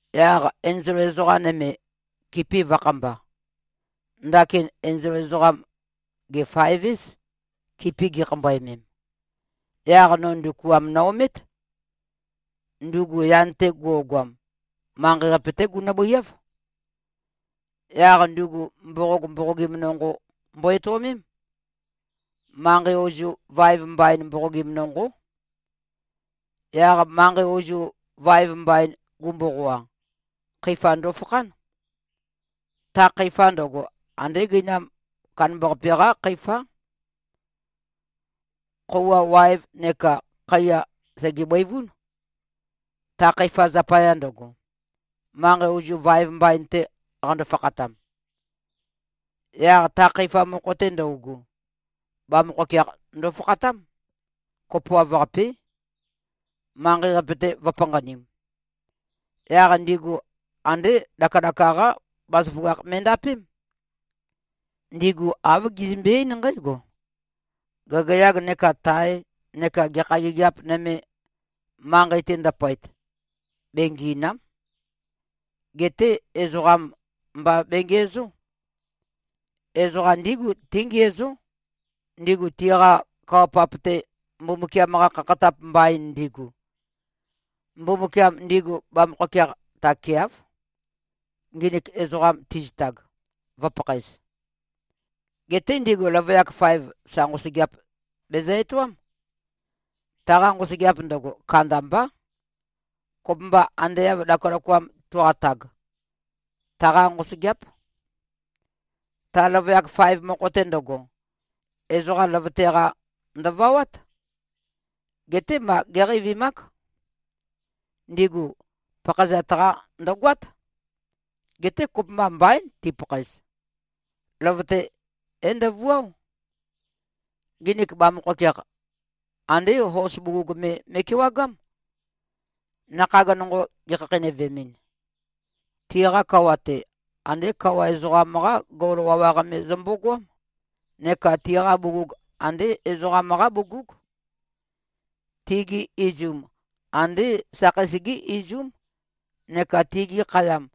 Yaq enzol ezoqa nøme, kipi vø̄khamba. Ndakin enzol ezoqam, gè-faev-éz, kipi gikhambøemem. Yaq no ndukuam no-omét. Ndugu yan-te guogoam, manqei-qape-té gunø-bøiáv. Yaq ndugu mboqog mboqogim nonqo mbo-etøomém. Manqei ozu vaev mbain mboqogim nonqó. Yaq manqei ozu vaev mbain gumboqoa, khøifa ndofakhán. Ta khøifa ndøgo, andé gøinam kandambaqape-qá khøifá. Khøuwa waev neka khaiya sège-bøivún, ta khøifa zapaya ndøgo, manqei ozu vaev mbain-te qando-fakhatam. Yaq ta khøifa mokho-te ndøugu, bamøkhokeakh ndofakhatám, kopoav-qapé, manqei-qape-te vø̄panqanim. Yaq ndigu andé lakalaka-qá bazaføgakh me꞉ndapém. Ndigu āv gizømbe-eín nqǽgo: Gagayag neka tae neka gekha gigiap nøme, manqei-te ndøpøet, bengì꞉na᷄m. Geté ezoqam mba bengiæzó. Ezoqam ndígu tíngiæzó, ndigu tiqa kawa-pap-te, Mbumbukiam-qa khakhatap mbain ndigu. Mbumbukiam ndigu bamøkhokeakh takeáv, nginik ezoqam tizitag, vǿpakhaēz. Geté ndigu løvøyak faev, sa nqosøgeap bezø-etoám. Taqa nqosøgeap ndøgo, kandambá. Kopømba ande av lakalakoam tuqatag, taqá nqosøgeáp. Ta løvøyak faev mokho-te ndøgo, ezoqa løvøte-qa, ndø̀vawát. Geté ma géqeivimák. Ndigu pakhaezat-qa, ndø̀goát. Geté kopømba mbaín tipakhaez. Løvøte é-ndøvuáo. Nginik bamøkhokeakh, andé hos bugug me me꞉kewagám, nakhag nonqo gikhakheinøvemɨn. Tiqa kawa-te, andé kawa ezoqam-qá gol wawaq me zømbogoám, neka tiqa bugug andé ezoqam-qá bugúg. Tigi izum, andé sakheis-gí izúm, neka tigi khayam,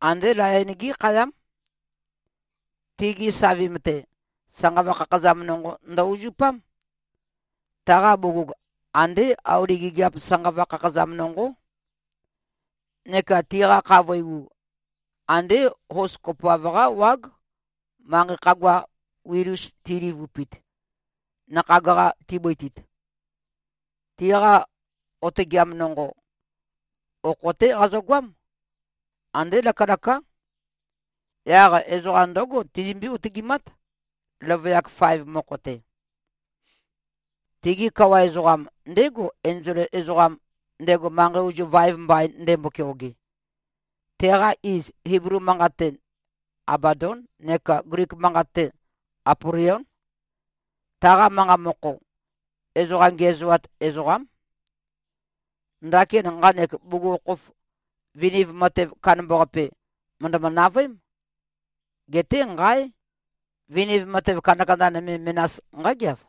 andé layon-gí khayám. Tigi savim-te, sanqava khakhazam nonqo ndø-uzupám. Taqa bugug andé auli gigiap sanqava khakhazam nonqó. Neka tiqa khavøi u, andé hos kopoav-qá wág, manqei khagua wil-us tilivupit, nakhag-qa tibøitit. Tiqa otøgeam nonqo, okho-té qazøgoám. Andé lakalaká. Yaq ezoqa ndǿgo tizømbí-otøgimát, løvøyak faev mokho-te. Tigi kawa ezoqam, ndégo, enzol ezoqam, ndego manqei ozu vaev mbain ndembo-keoge. Teqa iz, Iblu manqat-te, Abadón neka Glik manqat-te, Apolión. (Taqa manqa mokho, “Ezoqa ngiæzoat ezoqám.”) Ndakin nqanek bugukhokhof viniv matev kandambaqape, mø̀ndømø-navøém. Geté nqáe! Viniv matev kandakanda nøme menas nqágeav.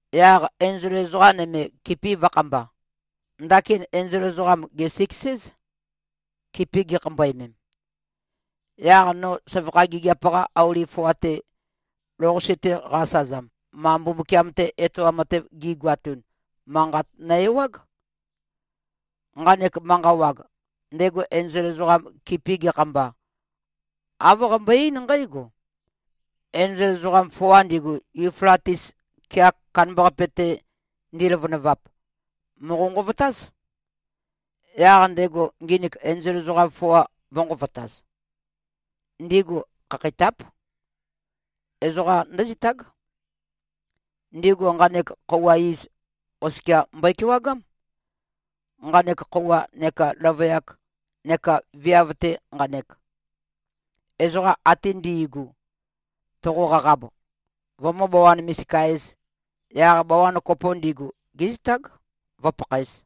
Yaq enzol ezoqa nøme, kipi vø̄khamba. Ndakin enzol ezoqam, gè-siks-éz, kipi gikhambøemem. Yaq no søvakha gigiap-qa auli foa-te, lou-qase-te qa-asøzam, ma Mbumbukiam-te etoam matev gi꞉goatun, manqat no-ewág. Nqanek manqa wag, ndego enzol ezoqam kipi gekhamba, āv qambøe-eín nqǽgo, “Enzol ezoqam foa ndigu, Yuflatis kea kandambaqape-te ndiløvønøvap, mòqo-nqovotáz.” Yaq ndego nginik enzol ezoqam foa vø̄nqovotaz. Ndigu khakheitáp. Ezoqa ndǿzitág. Ndigu nqanek khøuwa iz oskia mbøe-kewagám, nqanek khøuwa neka løvøyak neka viav-te nqanek. Ezoqa ate ndi꞉gu, toqo-qaqab, vømǿ-bawan-misika-ēz, yaq bawan kopo ndigu, gézitág, vǿpakhaēz.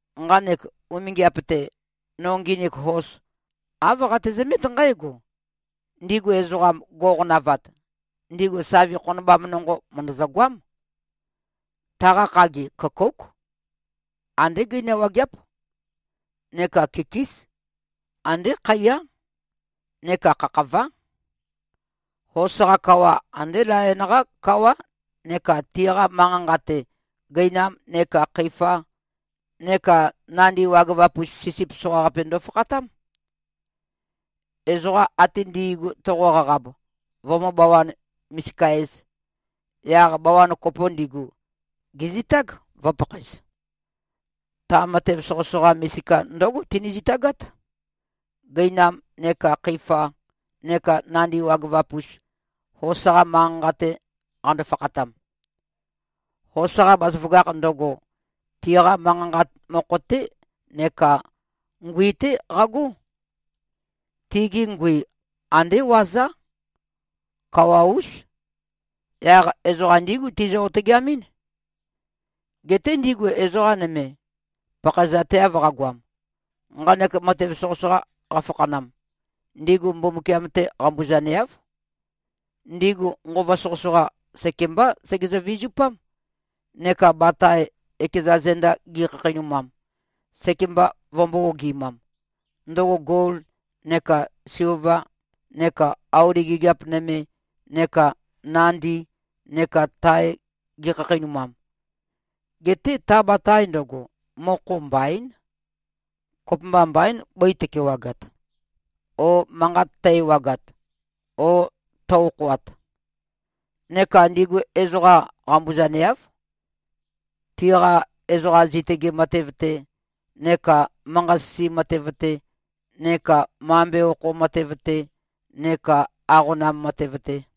Nqanek umingiap-te, no nginik hos, āv qatezømét nqǽgo: Ndigu ezoqam, go꞉qonavat, ndigu savi khonobam nonqo, mø̀ndøzø-goám. Taqa khagi, køkóuk. Andé gøina wageáp. Neka kikís. Andé khaiyá. Neka khakhavá. Hos-qa kawa, ande layon-qá kawá neka tiqa manqa-nqa-te, gøinam neka khøifa neka nandi wagøvap-us sisip soqaqape ndofakhatám. Ezoqa ate ndi꞉gu toqo-qaqab, vømǿ-bawan-misika-ēz, yaq bawan kopo ndigu, gèzitág, vø̄pakhaez. Ta matev soqøsoqa misika ndǿgo tini-zitagát, gøinam neka khøifa neka nandi wagøvap-us, hos-qa manqa-nqa-te qando-fakhatam. Hos-qa bazaføgakh ndøgo, tiqa manqa-nqa mokho-té neka ngui-té qagó. Tigi ngui, ande wazá. Kawa-ús. Yaq ezoqa ndígu tizø-otøgeamɨ́n. Geté ndigu ezoqa nøme, pakhaezateav qagoam, nqanek matev soqøsoqa qafakhanam, ndigu Mbumbukiam-te qambuzaneáv. Ndigu nqova soqøsoqa, sekembá segezø-vizupám, neka batae, ekeza zenda gi꞉khakheinumam, sekemba vømbō-ogi꞉mam, ndøgo gol neka silva neka auli gigiap nøme neka nandi neka tae gi꞉khakheinumam. Geté ta batae ndøgo, mokho mbaín. Kopømba mbaín, bøi tøkewagat o manqat tø-ewagat o tø-okhoat. Neka ndigu ezoqam qambuzaneáv, tiqa ezoqa zitøge matev-te neka manqa-sisi matev-te neka mambe okho matev-te neka aqonam matev-te.